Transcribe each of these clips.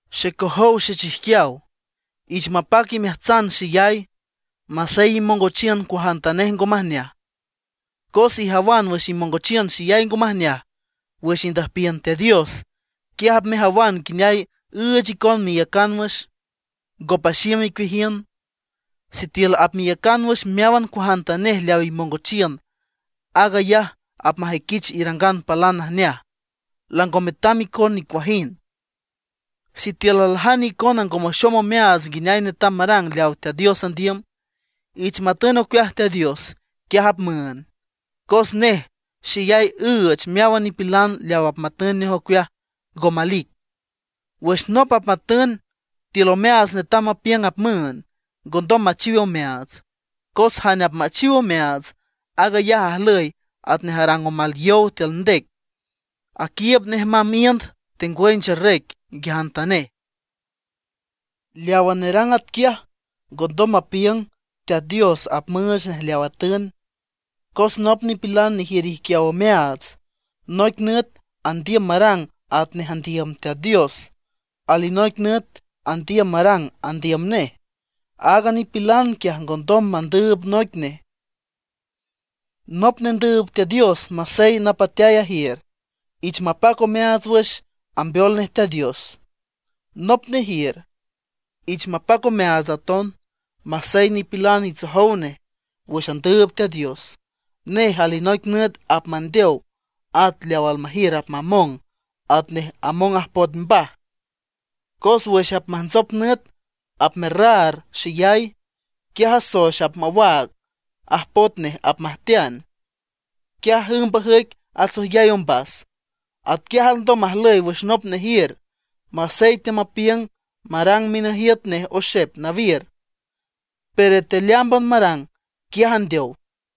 Xecojow xechijquiaw, ich mapac imeajtsan xeyay, masey imongochiün cuajantanej ngo majneaj. Cos ijawan wüx imongochiün xeyay ngo majneaj wüx indüjpiün Teat Dios, quiaj apmejawan nguineay üüch icon meiücan wüx, ngo paxiüm icueajiün. Sitiül apmeiücan wüx meáwan cuajantanej leaw imongochiün, aag ayaj apmajüiquich irangan palan najneaj, lango metam icon nicuajind. Sitiül aljane icona ngo maxom omeaats nguineay netam marang leaw Teat Dios andiüm, ich matün ocueaj Teat Dios, quiaj apmüünd. Cos nej xeyay üüch meáwan nipilan leaw apmatün nej ocueaj, ngo malic. Wüx nop apmatün, tiül omeaats netam mapiüng apmüünd, ngondom machiw omeaats, cos jane apmachiw omeaats, aag ayaj ajlüy atnej arang omal yow tiül ndec, aquiiüb nej mamb iünd tengwüy ncherrec nguiajantanej. Leawa nerang atquiaj ngondom mapiüng Teat Dios apmüüch nej leaw atün. Cos nop nipilan nejiür ijquiaw omeaats, noic nüt andiüm marang atnej andiüm Teat Dios, alinoic nüt andiüm marang andiüm nej. Aaga nipilan quiaj ngondom mandüüb noic nej. Nop nendüüb Teat Dios masey napateay ajiür, ich mapac omeaats wüx ambeol nej Teat Dios. Nop nejiür, ich mapac omeaats aton, masey nipilan itsojow nej wüx andüüb Teat Dios. Nej alinoic nüt apmandeow, at leaw almajiür apmamong atnej among ajpoet mbaj. Cos wüx apmajntsop nüt apmerraar xeyay, quiaj soex apmawaag, ajpoet nej apmajtean, quiaj ümb ajüic atsüjyay ombas. Atquiaj alndom majlüy wüx nop nejiür, masey teamapiüng marang minajiüt nej oxep nawiür, pero tealeámban marang, quiaj andeow.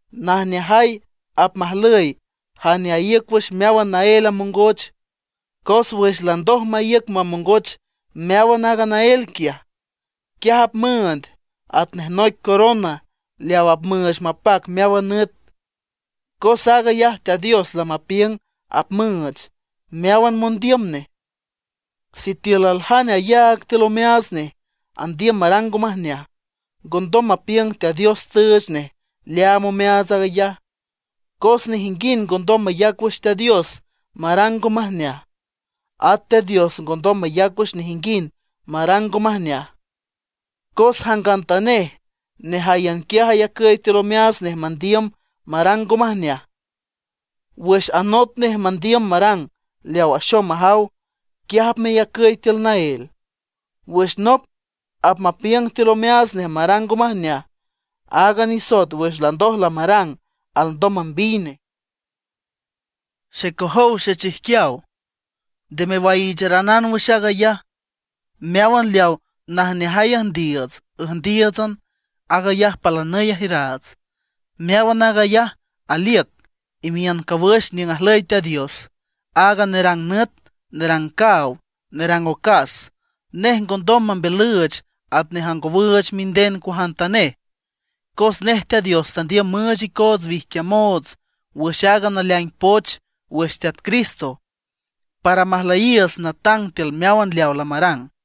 Najneajay apmajlüy jane aíüc wüx meáwan naél amongoch, cos wüx landoj maíüc mamongoch meáwan aaga naél quiaj, quiaj apmüünd atnej noic corona leaw apmüüch mapac meáwan nüt, cos aag ayaj Teat Dios lamapiüng apmüüch meáwan mondiüm nej. Sitiül aljane ayaag tiül omeaats nej andiüm marang ngo majneaj, ngondom mapiüng Teat Dios tüüch nej leaam omeaats aag ayaj, cos nejinguind ngondom mayac wüx Teat Dios marang ngo majneaj, at Teat Dios ngo mayac wüx nejinguind marang ngo majneaj. Cos jangantanej nejáyan quiaj ayacüy tiül omeaats nej mandiüm marang ngo majneaj, wüx anot nej mandiüm marang leaw axom majaw, quiaj apmeyacüy tiül naél. Wüx nop apmapiüng tiül omeaats nej marang ngo majneaj, aaga nisoet wüx landoj lamarang alndom mambiy nej. Xecojow xechijquiaw, nde mewaiicharanan wüx aag ayaj. Meáwan leawa najneajay üjndiiüts üjndíiütsan, aag ayaj palanüy ajiüraats. Meáwan aag ayaj aliüc imiün cawüx niüng ajlüy Teat Dios, aaga nerang nüt, nerang caaw, nerang ocas. Nej ngondom mambiülüüch atnej angowüüch minden cuajantanej. Cos nej Teat Dios tandiüm müüch icoots wijquiamoots wüx aaga naleaing poch wüx Teat Cristo, para majlüyiiüts natang tiül meáwan leawa lamarang.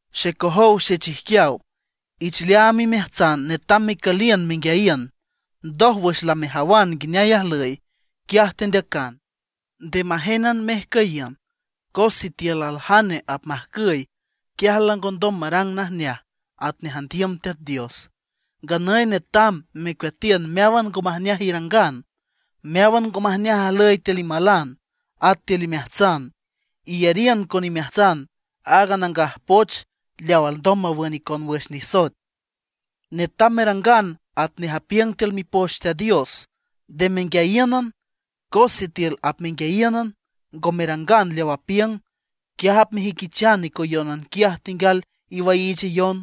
Xecojow xechijquiaw, ich leaam imeajtsan netam mecüliün menguiayiün. Ndoj, wüx lamejawan nguineay ajlüy, quiaj tendeacan. Nde majénan mejcüyiün. Cos sitiül aljane apmajcüy, quiaj langondom marang najneaj atnej andiüm Teat Dios. Nganüy netam mecueatiün meáwan ngo majneaj irangan, meáwan ngo majneaj ajlüy tiül imalan at tiül imeajtsan. Iyariün con imeajtsan aaga Nangaj Poch leaw alndom mawün icon wüx nisoet. Netam merangan atnej apiüng tiül Mipoch Teat Dios, nde menguiayíünan. Cos sitiül apmenguiayíünan, ngo merangan leaw apiüng, quiaj apmejüiquichan icoyónan quiaj tenguial iwaiichayon.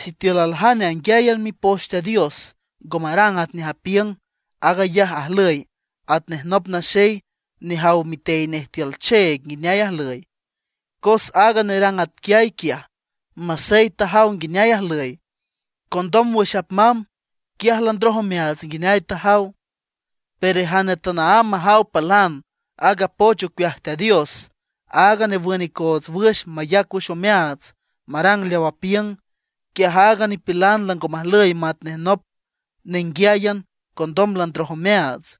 Sitiül aljane anguiáyan Mipoch Teat Dios, ngo marang atnej apiüng, aag ayaj ajlüy atnej nop naxey nejaw mitey nej tiül cheeg nguineay ajlüy. Cos aaga nerang atquiay quiaj masey tajaw nguineay ajlüy, condom wüx apmamb, quiaj landroj omeaats nguineay tajaw. Pero jane tanaámb majaw palan aaga poch ocueaj Teat Dios aaga newün icoots wüx, mayac wüx omeaats marang leaw apiüng, quiaj aaga nipilan lango majlüy matnej nop nenguiáyan condom landroj omeaats.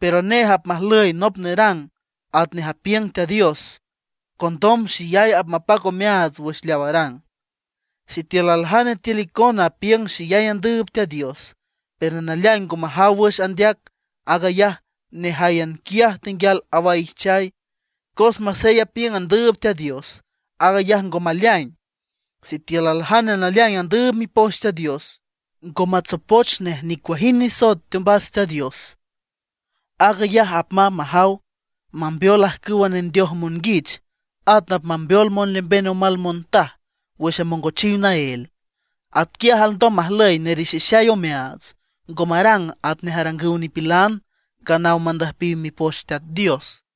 Pero nej apmajlüy nop nerang atnej apiüng Teat Dios, condom xeyay apmapac omeaats wüx leaw arang. Sitiül aljane tiül icona apiüng xeyay andüüb Teat Dios, pero naleaing ngo majaw wüx andeac, aag ayaj nejáyan quiaj tenguial awaijchay, cos masey apiüng andüüb Teat Dios, aag ayaj ngo maleaing. Sitiül aljane naleaing andüüb Mipoch Teat Dios, ngo matsopoch nej nicuajind nisoet teombas Teat Dios; aag ayaj apmamb majaw mambeol ajcüwa nendeoj monguich, at apmambeol monlemben omal montaj wüx amongochiw naél. Atquiaj alndom majlüy nerixixay omeaats, ngo marang atnej arangüw nipilan nganaw mandüjpiw Mipoch Teat Dios.